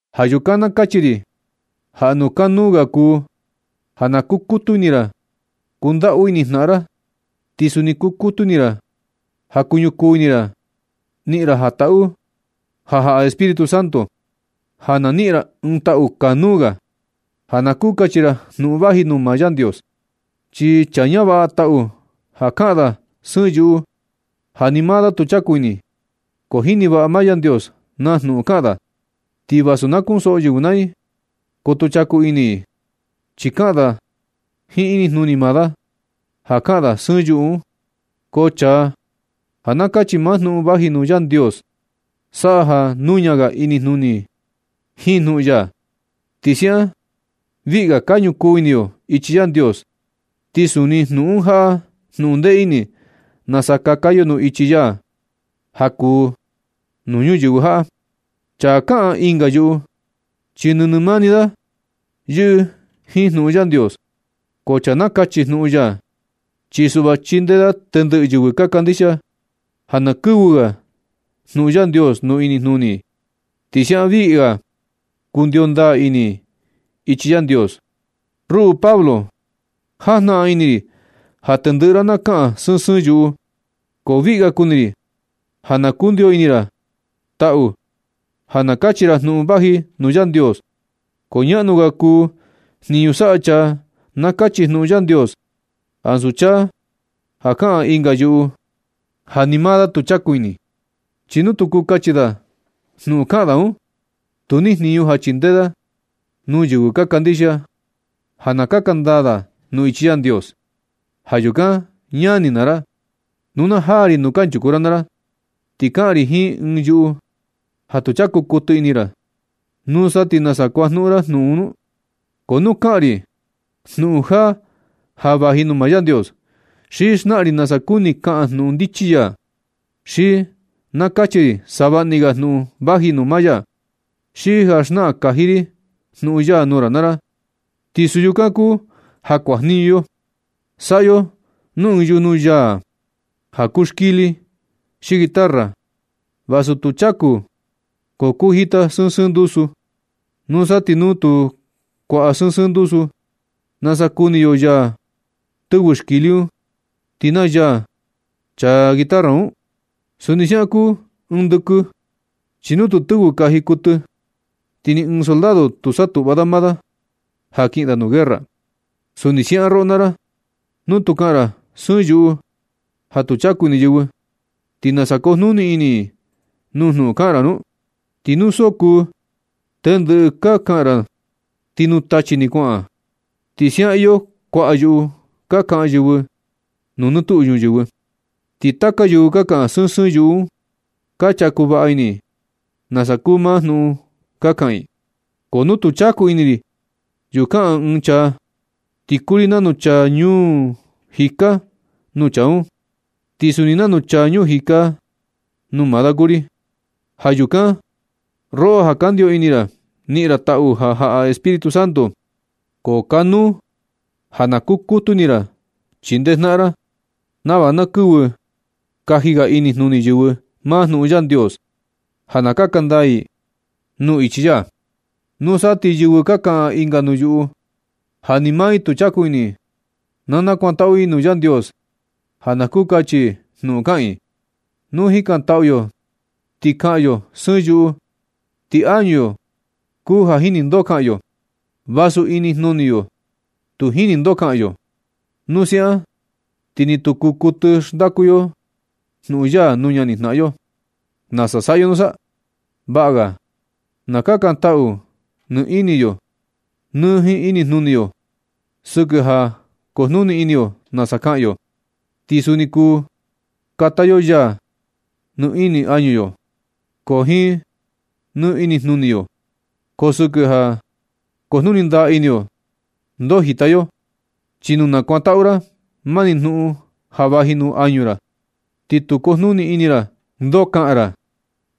Ja yukan na kachi ri ja jnuꞌun kanuu ga kuu ja na kukutu ini ra kundaꞌu ini jnaꞌan ra. Ti suni kukutu ini ra ja kuñukuu ini ra niꞌin ra taꞌu ja jaꞌa Espíritu Santo, ja na niꞌin ra ɨɨn taꞌu kanuu ga ja na kuu nakachi ra jnuꞌun vaji nuu maa Yandios. Chi chaa ñavaꞌa taꞌu ja kaꞌan da sɨɨn yuꞌu ja ni maa da tu chaku ini. Ko jini vaꞌa maa Yandios naa jnuꞌun kaꞌan da, ti vasu ka ñusoꞌo yɨvɨ naa i, ko tu chaku ini i. Chi kaꞌan da jiin inijnuni maa da ja kaꞌan da sɨɨn yuꞌu un. Ko chaa ja nakachi maa jnuꞌun vaji nuu Yandios, saꞌa ja nuña ga inijnuni yo jiin jnuꞌun ya, ti siaꞌan viꞌi ga ka ñukuu ini yo ichi Yandios. Ti suni jnuꞌun un jaꞌa jnuꞌun ndee ini nasa kaka yo nuu ichi ya ja kuu nuu ñuyɨvɨ jaꞌa. Chaa kaꞌan ɨnga yuꞌu, chi nɨnɨ mani da yɨꞌɨ jiin jnuꞌun Yandios. Ko chaa nakachi jnuꞌun ya, chi suꞌva chindee da tendɨꞌɨ yɨvɨ ka kandixia ja na kɨvɨ kaji ga jnuꞌun Yandios nuu inijnuni i. Ti siaꞌan viꞌi ga kundio ndaa ini i ichi Yandios. Ruꞌu Pablo, jajnaꞌan ini ri ja tendɨꞌɨ ra na kaꞌan sɨɨn sɨɨn yuꞌu, ko viꞌi ga kuni ri ja na kundiyo ini ra taꞌu ja nakachi ra jnuꞌun vaji nuu Yandios. Ko ñaꞌnu ga kuu jniñu saꞌa chaa nakachi jnuꞌun Yandios, ansu chaa ja kaꞌan ɨnga yuꞌu ja ni maa da tu chaku ini. Chi nu tu kuu nakachi da jnuꞌun kaꞌan da un, tu ni jniñu ja chindee da nuu yɨvɨ ka kandixia, ja na kaka ndaa i nuu ichi Yandios. Ja yukan ñani naa ra, nu na jaa ri nuu kanchuku ra naa ra, ti kaꞌan ri jiin sɨɨn yuꞌu ja tu chaku kuɨtɨ ini ra, ¿nusa ti nasa kuajniñu jnuꞌun un nu? Ko nu kaꞌan ri jnuꞌun jaa ja vaji nuu maa Yandios, xi xnaꞌan ri nasa kuni kaꞌan jnuꞌun ndichi ya, xi ja nakachi ri savaꞌni ga jnuꞌun vaji nuu maa ya, xi ja xnaꞌan kaji ri jnuꞌun ya nuu ra naa ra, ti suu yukan kuu ja kuajniñu yo. Saꞌa yo nuu ɨɨn yujnu yaa ja kuu xkili xi guitarra, vasu tu chaku, ko kuu jita sɨɨn sɨɨn ndusu. Nusa ti nu tu kuaꞌa sɨɨn sɨɨn ndusu, ¿nasa kuni yo naa yaa tɨvɨ xkili un, ti naa yaa chaa guitarra un? Suni siaꞌan kuu ɨɨn ndɨkɨ, chi nu tu tɨvɨ kaji kuɨtɨ, ti ni ɨɨn soldado tu satuꞌva da maa da ja kiꞌin da nuu guerra. Suni siaꞌan roꞌo naa ra, nu na kaꞌan ra sɨɨn yuꞌu ja tu chaku ini yɨvɨ, ¿ti nasa kujnuni ini i nuu jnuꞌun kaꞌan ra un? Ti nu so kuu tɨndɨꞌɨ kaꞌan kaꞌan ra, ti nuu tachi ni kuaꞌan un. Ti siaꞌan iyo kuaꞌa yuꞌu ka kaꞌan yɨvɨ nuu nɨ tuꞌu ñuyɨvɨ, ti taka yɨvɨ ka kaꞌan sɨɨn sɨɨn yuꞌu un ka chaku vaꞌa ini i nasa kuu maa jnuꞌun ka kaꞌan i. Ko nu tu chaku ini ri yuꞌu kaꞌan ɨɨn chaa, ti kuu ri nanu chaa ñuu jika nuu chaa un, ti suni nanu chaa ñuu jika kuu maa da nuu ri. Ja yukan, roꞌo ja ka ndio ni ini ra niꞌin ra taꞌu ja jaꞌa Espíritu Santo, ko kanuu ga ja na kukutu ini ra chindee jnaꞌan ra, nava na kɨvɨ kaji ga inijnuni yɨvɨ maa jnuꞌun Yandios ja na kaka ndaa i nuu ichi ya. Nusa ti yɨvɨ ja kaꞌan ɨnga yuꞌu ja ni maa i tu chaku ini, na kakantaꞌu i nuu Yandios ja na kuu nakachi i jnuꞌun kaꞌan i un. Nu jikantaꞌu yo ti kaꞌan yo sɨɨn yuꞌu, ti añu yo kuu ja jini ndoo kaꞌan yo, vasu inijnuni yo tu jini ndoo kaꞌan yo. Nu siaꞌan ti ni tu kuu kuɨtɨ xndaku yo jnuꞌun ya nuu ñanijnaꞌan yo. ¿Nasa saꞌa yo nusa? Vaꞌa ga na kakantaꞌu ni ini yo nɨ jiin inijnuni yo sɨkɨ ja kujnuni ini yo nasa kaꞌan yo. Ti suni kuu kata yo yaa nɨ ini añu yo, ko nɨ jiin inijnuni yo, ko sɨkɨ ja kujnuni ndaa ini yo ndoo jita yo. Chi nu nakuatu ra mani jnuꞌun ja vaji nuu añu ra, ti tu kujnuni ini ra ndoo kaꞌan ra,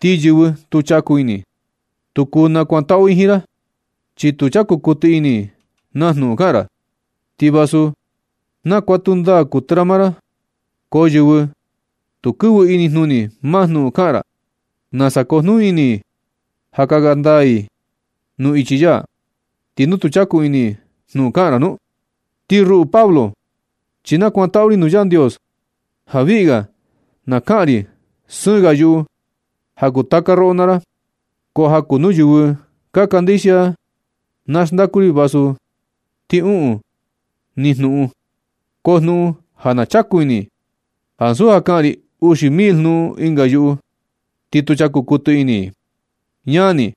ti yɨvɨ tu chaku ini, tu kuu nakuatu i jiin ra, chi tu chaku kuɨtɨ ini i na jnuꞌun kaꞌan ra. Ti vasu nakuatu ndaa kuɨtɨ maa ra, ko yɨvɨ tu kɨvɨ inijnuni naa jnuꞌun kaꞌan ra, ¿nasa kujnuni ini i ja kaka ndaa i nuu ichi ya, ti nu tu chaku ini i jnuꞌun kaꞌan ra nu? Ti ruꞌu Pablo, chi nakuantaꞌu ri nuu Yandios ja viꞌga na kaꞌan ri sɨɨn ga yuꞌu ja kuu taka roꞌo naa ra. Ko ja kuu nuu yɨvɨ ka kandixia na xndaku ri vasu ti uꞌun ni jnuꞌun, ko jnuꞌun ja na chaku ini i, ansu ja kaꞌan ri uxi mil jnuꞌun ɨnga yuꞌu, ti tu chaku kuɨtɨ ini i. Ñani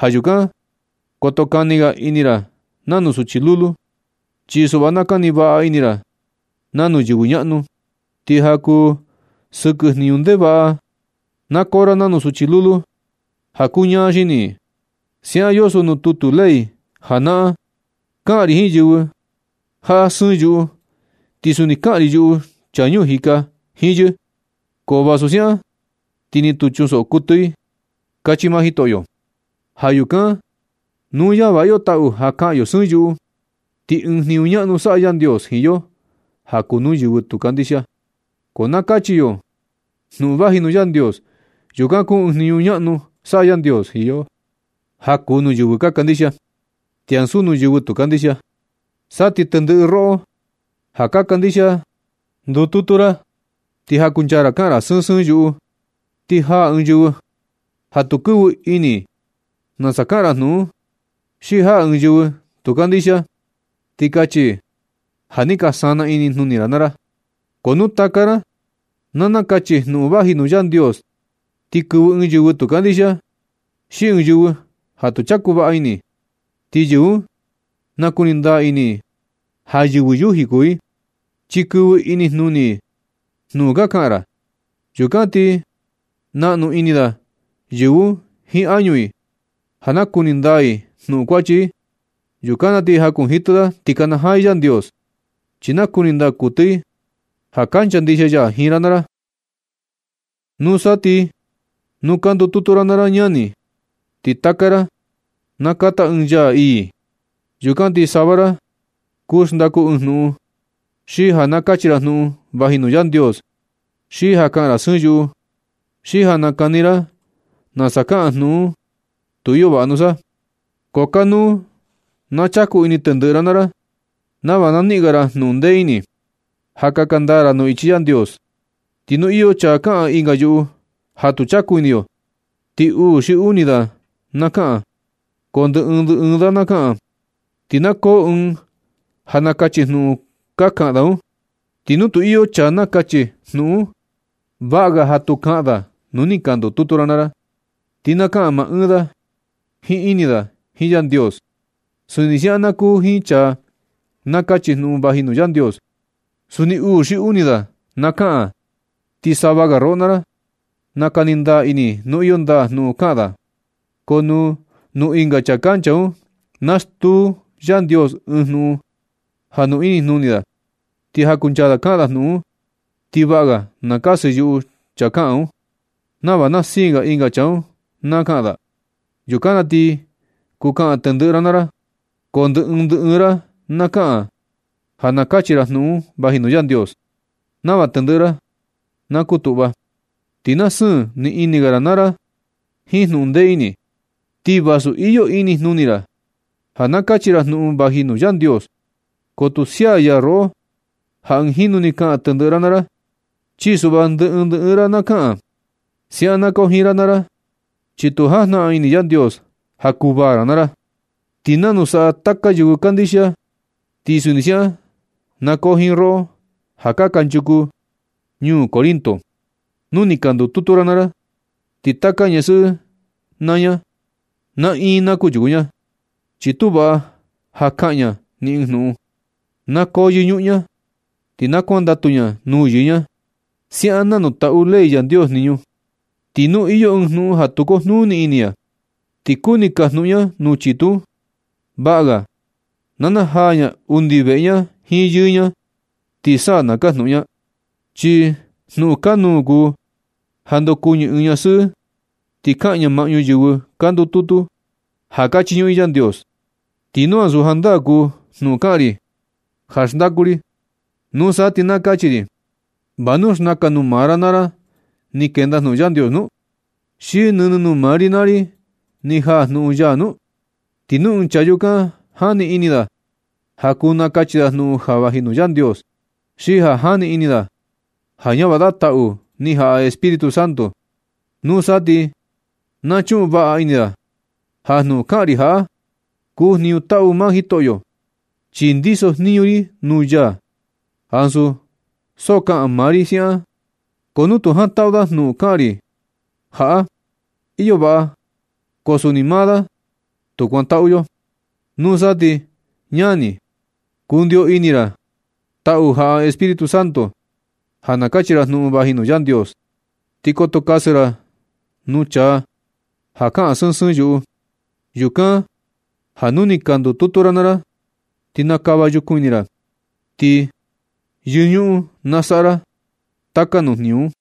ja yukan koto kani ga ini ra nanu suchi lulu, chi suꞌva na kani vaꞌa ini ra nanu yɨvɨ ñaꞌnu. Ti ja kuu sɨkɨ jniñu ndevaꞌa na koo ra nanu suchi lulu ja kuu ñaa xini i. Siaꞌan yoso nuu tutu ley janaꞌan: “Kaꞌan ri jiin yɨvɨ jaꞌa sɨɨn yuꞌu, ti suni kaꞌan ri yuꞌu chaa ñuu jika jiin yɨ. Ko vasu siaꞌan ti ni tu chunsoꞌo kuɨtɨ”, kachi maa Jitoꞌyo. Ja yukan nu ñavaꞌa yo taꞌu ja kaꞌan yo sɨɨn yuꞌu, ti ɨɨn jniñu ñaꞌnu saꞌa Yandios jiin yo ja kuu nuu yɨvɨ tu kandixia, ko ja nakachi yo jnuꞌun vaji nuu Yandios. Yukan kuu ɨɨn jniñu ñaꞌnu saꞌa Yandios jiin yo ja kuu nuu yɨvɨ ka kandixia, ti ansu nuu yɨvɨ tu kandixia. Sa ti tendɨꞌɨ roꞌo ja ka kandixia ndututu ra, ti jakuncha ra kaꞌan ra sɨɨn sɨɨn yuꞌu, ti jaa ɨɨn yɨvɨ ja tu kɨvɨ ini nasa kaꞌan jnuꞌun un, xi jaa ɨɨn yɨvɨ tu kandixia, ti kachi i ja ni ka sana inijnuni ra naa ra. Ko nu taka ra na nakachi jnuꞌun vaji nuu Yandios, ti kɨvɨ ɨɨn yɨvɨ tu kandixia, xi ɨɨn yɨvɨ ja tu chaku vaꞌa ini, ti yɨvɨ un na kuni ndaa ini i ja yɨvɨ yuji kuu i, chi kɨvɨ ini jnuni i jnuꞌun ka kaꞌan ra. Yukan ti naꞌnu ini da yɨvɨ un jiin añu i ja nakuni ndaa i nuu kuachi i. Yukan na ti jakunjitɨ i ti na kanajaa i Yandios, chi nakuni ndaa kuɨtɨ i ja kancha ndixia ya jiin ra naa ra. Nusa ti nu ka ndututu ra naa ra ñani, ti taka ra na kata ɨɨn yaa ii. Yukan ti sava ra kuu xndaku ɨɨn jnuꞌun, xi ja nakachi ra jnuꞌun vaji nuu Yandios, xi ja kaꞌan ra sɨɨn yuꞌu, xi ja nakani ra nasa kaꞌan jnuꞌun un. Ti iyo vaꞌa nusa, ko kanuu na chaku ini tendɨꞌɨ ra naa ra nava na niꞌin ga ra jnuꞌun ndee ini, ja kaka ndaa ra nuu ichi Yandios. Ti nu iyo chaa kaꞌan ɨnga yuꞌu ja tu chaku ini yo, ti uu xi uni ni da na kaꞌan, ko ndɨ ɨɨn ndɨ ɨɨn da na kaꞌan, ti na koo ɨɨn ja nakachi jnuꞌun ka kaꞌan da un. Ti nu tu iyo chaa ja nakachi jnuꞌun un, vaꞌa ga ja tu kaꞌan da nu ni ka ndutu ra naa ra, ti na kaꞌan maa ni da jiin ini da jiin Yandios. Suni siaꞌan na kuu jiin chaa nakachi jnuꞌun vaji nuu Yandios. Suni uu xi uni ni da na kaꞌan, ti sava ga roꞌo naa ra, nakani ndaa ini nu iyo ndaa jnuꞌun kaꞌan da un. Ko nu nuu ɨnga chaa kancha un, na stuu Yandios ɨɨn jnuꞌun jaa nuu inijnuni da, ti jakuncha da kaꞌan da jnuꞌun un, ti vaꞌa ga na kasɨ yuꞌu chaa kaꞌan un, nava na siin ɨnga chaa un na kaꞌan da. Yukan na ti kuu kaꞌan tendɨꞌɨ ra naa ra, ko ndɨ ɨɨn ndɨ ɨɨn ra na kaꞌan ja nakachi ra jnuꞌun vaji nuu Yandios, nava tendɨꞌɨ ra na kutuꞌva, ti na siin nɨ ini ga ra naa ra jiin jnuꞌun ndee ini. Ti vasu iyo inijnuni ra ja nakachi ra jnuꞌun vaji nuu Yandios, ko tu sia ya roꞌo ja ɨɨn jinu ni kaꞌan tendɨꞌɨ ra naa ra, chi suꞌva ndɨ ɨɨn ndɨ ɨɨn ra na kaꞌan. Siaꞌan na koo jiin ra naa ra, chi tu jajnaꞌan ini Yandios ja kuvaa ra naa ra. Ti nanu saꞌa taka yɨvɨ kandixia, ti suni siaꞌan na koo jiin roꞌo ja kanchuku ñuu Corinto, nu ni ka ndututu ra naa ra, ti taka ñasɨꞌɨ naa ña, naꞌin na kunchuku ña, chi tu vaꞌa ja kaꞌan ña ni ɨɨn jnuꞌun. Na koo yɨñuꞌun ña, ti na kuandatu ña nuu yɨɨ ña siaꞌan nanu taꞌu ley Yandios jniñu. Ti nu iyo ɨɨn jnuꞌun ja tu kujnuni ini ña, ti kuni kajnuꞌun ña nuu chitu un, vaꞌa ga na najaa ña undi veꞌe jiin yɨɨ ña, ti sa na kajnuꞌun ña, chi jnuꞌun kanuu kuu ja ndokuɨñɨ ɨɨn ñasɨꞌɨ ti kaꞌan ña maꞌñu yɨvɨ ka ndututu ja ka chiñuꞌun i Yandios. Ti nu ansu jandaa kuu jnuꞌun kaꞌan ri ja xndaku ri, nusa ti na kachi ri: ¿Va nu xnakan nuu maa ra naa ra ni kenda jnuꞌun Yandios nu? ¿Xi nɨnɨ nuu mani ra naa ra ni jaa jnuꞌun ya nu? Ti nu ɨɨn chaa yukan jani ini da ja kuu nakachi da jnuꞌun ja vaji nuu Yandios, xi ja jani ini da ja ñavaꞌa da taꞌu ni jaꞌa Espíritu Santo, nusa ti na chuꞌun vaꞌa ini da ja jnuꞌun kaꞌan ri jaꞌa kuu jniñu taꞌu maa Jitoꞌyo, chi ndiso jniñu ri nuu ya, ansu so kaꞌan maa ri siaꞌan ni. Ko nu tu jantaꞌu da jnuꞌun kaꞌan ri jaꞌa, iyo vaꞌa, ko suni maa da tu kuantaꞌu yo. Nusa ti, ñani, kundio ni ini ra taꞌu jaꞌa Espíritu Santo ja nakachi ra jnuꞌun vaji nuu Yandios. Ti koto kasɨ ra nuu chaa ja kaꞌan sɨɨn sɨɨn yuꞌu. Yukan ja nu ni ka ndututu ra naa ra ti na kava yukun ini ra, ti yɨñuꞌun na saꞌa ra taka nuu jniñu un.